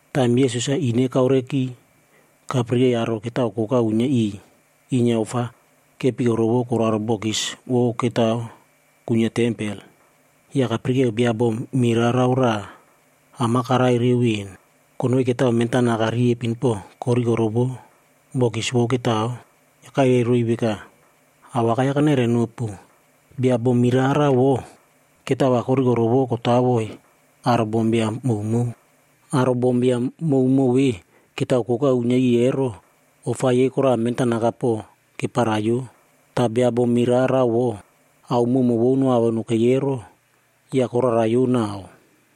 Taim Yesus-a ine kaureki, kapirikei aro ketao koka uinyia iꞌiy inyia ofa kepikorovo koraro bokis vou ketaoa kuinyia tempel. Ya kapirikeo bia bom mirarao raꞌa am-a karai reu ven. Konoi ketao mentanaka riepin po korikorovo bokis vou ketao. Ya kairai roiy veka, “Awakai-ya kanairai nopu, bia bom mirarao vo, ketao va korikorovo kotawoi aro bombiam mowmow. Aro bombiam mowmow ve ketao koka uinyia iꞌiy ero, ofa yei koraꞌa mentanaka po keparaiyo. Ta bia bom mirarao vo, ao mowmow vou noavo nokei ero, ya koraraiyo nau.”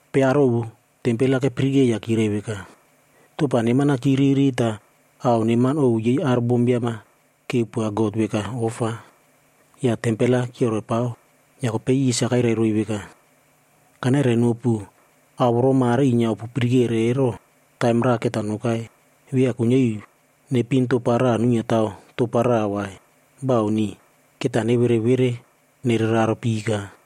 Kopei aro ovu tempel-a kepirike ya kyirai veka, “Topa neman-a kyiriri ta ao neman ovu yei aro bombiam-a kepoa God veka ofa, ya tempel-a kyioropao.” Ya kopei Yesus-a kairai roiy veka, “Kanairainopu ao voro mare inyia opu pirikere ero, taim raꞌa keta nokai, via kuinyia iu nepin topa raꞌa nuinyia taw topab raꞌa vai. Bauni. Keta nevereꞌvere nereraro pika.”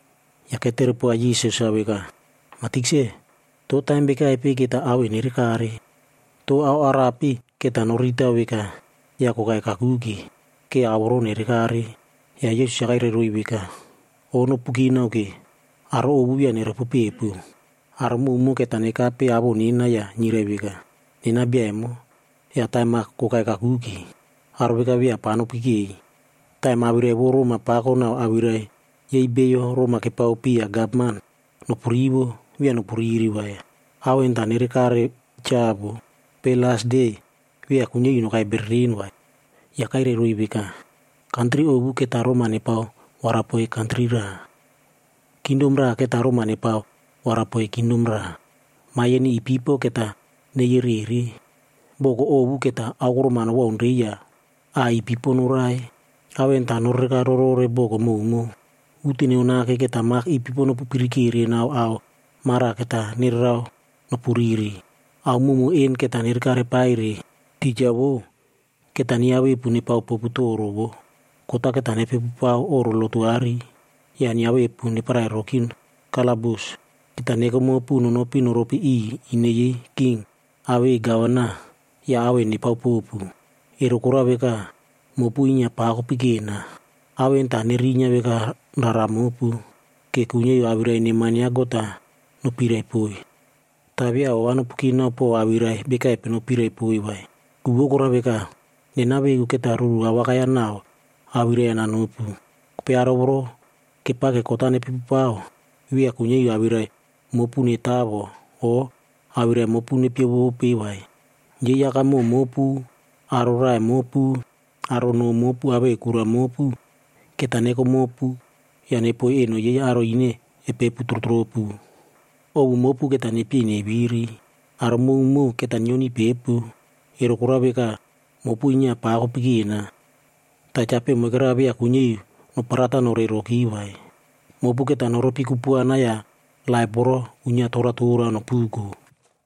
Ya ketere poa Yesus-a veka, “Ma Tikse, to taim bekaipe keta ao en nerekare? To ao arape keta noriritao veka ya kokai kakuke, ke ao voro nerekare?” Ya Yesus-a kairai roiy veka, “O nopu kinao ke, aro ovu via neropopepu. Aro mowmow keta nekape awoꞌo nena ya nyirai veka, ‘Nena bia emo,’ ya ‘Taim-a kokai kakuke.’ Aro veka via pa nopikei. Taim awirai vou roma pako nau awirai yei beiyo roma kepaopiya gavman nopurivo, via nopuriri vai. Ao en ta nerekare cha vo, kopei las de, via kuinyia iu nokaika bereren vai.” Ya kairai roiy veka, “Kantri ovu keta roma nepao warapoiy kantri raꞌa. Kingdom raꞌa keta roma nepao warapoiy kingdom raꞌa. Maiyeni ipipo keta neyerere. Boko ovu keta aokorom-a nowaunrei ya a ipipo noraie. Ao en ta norereka rorore boko mowmow. Uteno nake keta mak ipipo nopupirikere nau ao mara keta nererao nopuriri. “Ao mowmow en keta nerekare paire, tija vou, keta nyiavepu nepao popu toro voꞌo. Kot-a keta nepepupao oꞌro lotu aꞌari, ya nyiavepu neparai roki kalabus. Keta neko mopu nonopi noropi iꞌiy ine yei king awei gavana ya ao en nepao popu. Ero korao veka, mopu inyia pa kopikena. Ao en ta nerinyia veka rara mopu, ke kuinyia iu awirai neman ya God-a nopiraipoiy. Ta via ova nopu kinao po awirai bekaipe nopiraipoiy vai. Ku vou korao veka, nena veku keta ruru awakai-ya nau awirai-ya nanopu. Kopei aro voro kepake kot-a nepepupao, via kuinyia iu awirai mopu netawo o awirai mopu nepyevope vai. Yei akamoꞌo mopu, aro raꞌai mopu, aro noꞌo mopu awei kura mopu, keta neko mopu ya nepoiy eno yei aro ine epepu trotropu. Ovu mopu keta nepyei neviri. Aro mowmow keta nyioniy pepu, ero korao veka, mopu inyia pa kopikena. Ta chapeꞌe moikera via kuinyia iu noparatao norei roki vai.c Mopu keta noropi kupuana ya laip voro uinyia toratora nopuko.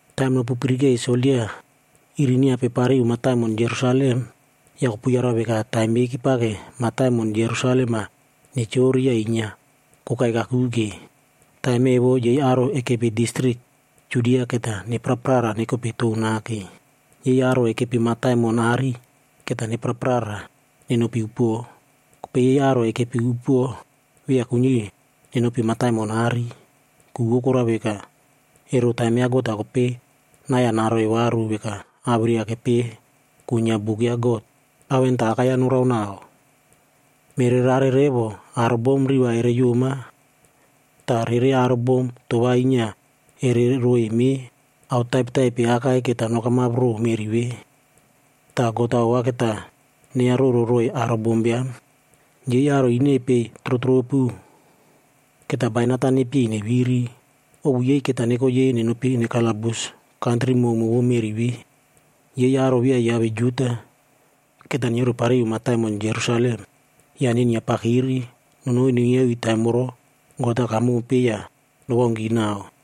“Taim nopupirikei soldia iri nyiape pariu mataimon Jerusalem, ya kopu yarau veka taim yei kepake mataimon Jerusalem-a nechori ya inyia kokai kakuke. Taim evo yei aro ekepi distrik Judia keta nepraprara nekope tou nake. Yei aro ekepi mataimon aꞌari keta nepraprara nenopi upuo. Kopei yei aro ekepi upuo, via kuinyia iu nenopi mataimon aꞌari. Ku vou korao veka, ero taim ya God-a kopei nai-ya naroiy varu veka awirai-ya kepeꞌe kuinyia buk ya God. Ao en ta akai-ya noraonao. Mererare revo aro bom riꞌi va ereyoma ta rere aro bom toꞌo va inyia ere roiy meꞌe. Ao taipetaipe akai keta nokamap row meꞌri ve, ta God-a ova keta neiya roro roiy aro bombiam. Yei aro ine epei trotropu, keta bainat-a nepyei neviri. Ovu yei keta neko yei nenopi nekalabus kantri mowmow vou meꞌri ve. Yei aro via yiave Juda, keta nyiorepariu mataimon Jerusalem ya nenyiapakiri nonoi nuinyia iu taim voro God-a kamompe ya nowaunki nau.”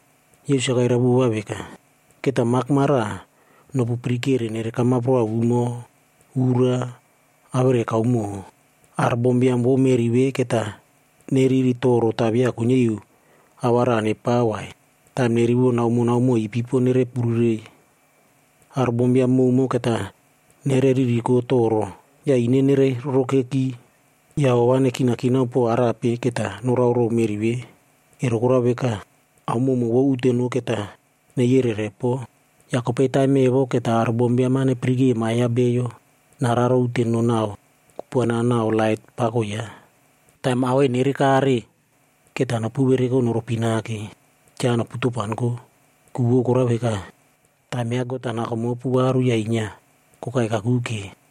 Yesus-a kairai vova veka, “Keta mak mara nopupirikere nerekamap roa umo, ura awere kaumo. Aro bombiam vou meꞌri ve keta neriri toro ta via kuinyia iu ao va raꞌa nepao vai, taim nerivo naomo naomo ipipo nere pururei. Aro bombiam mowmow keta neririko toro ya ine nerei rorokeki ya ova nekinakinao pow arape keta norao row meꞌri ve. Ero korao veka, ao kupuana mowmow vou uteno keta neiyerere po. Ya kopei taim evo keta aro bombiam-a nepirike Ma ya Bio nararo uteno nau kupuana nau lait pako yaꞌa. Taim ao en nerekare, keta nopu vereko noropi nake, cha nopu topanko. Ku vou korao veka, taim ya God-a nako mopu varu ya inyia kokai kakuke.”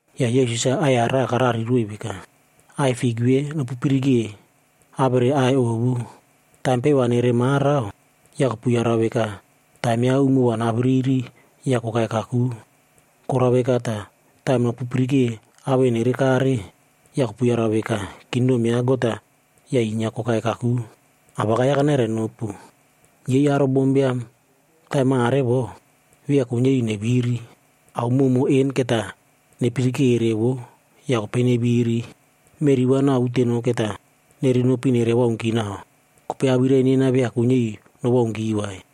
Ya Yesus-a aꞌai-ya raꞌa karariroiy veka, “Aꞌai fik ve nopupirike awere aꞌai ovu. Taim peꞌe va nere marao, ya kopu yarau veka taim ya umo va naviriri ya kokai kaku. Korao veka ta, taim nopupirike ao en nerekare, ya kopu yarau veka kingdom ya God-a ya inyia kokai kaku. “Awakai-ya kanairai nopu, yei aro bombiam taim mare vo, via kuinyia iu neviri. Ao mowmow en keta nepirikere vo ya kopei neviri. Meꞌri va nau uteno keta nerenopi nere waunki nau, kopei awirai nena via kuinyia iu nowaunki vai.”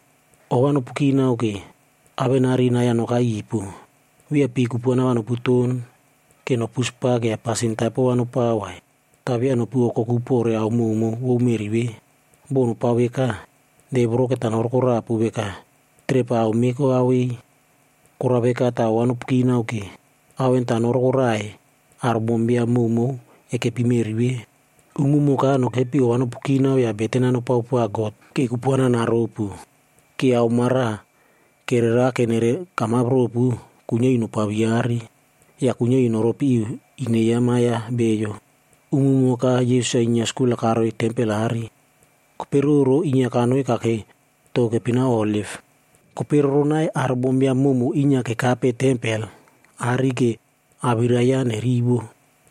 “Ova nopu kinao ke, awenari nai-ya nokai ipu. Via pii kupuana va noputon ke nopu spak ya pasin taipo va nopao vai. Ta via nopu okoku pore ao mowmow vou meꞌri ve. Bo nopao veka, de voro keta norokorapu veka trep-a aomeꞌe koavei. Korao veka ta ova nopu kinao ke, ao en ta norokoraiy aro bombiam mowmow ekepi meꞌri ve. Umumoka nokepi ova nopu kinao ya beten-a nopao poa God, ke kupuana naropu. Ke ao mara kererake nere kamap ropu, kuinyia iu nopaviare. Ya kuinyia iu noropi iu ine ya Ma ya Bio.” Umumoka Yesus-a inyia skul-a karoiy tempel aꞌari. Kopei roro, inyia kanoi kakei tou keipinao Oliv. Kopei roronai, aro bombiam mowmow inyia kekape tempel aꞌari ke awirai yaꞌa nerivo.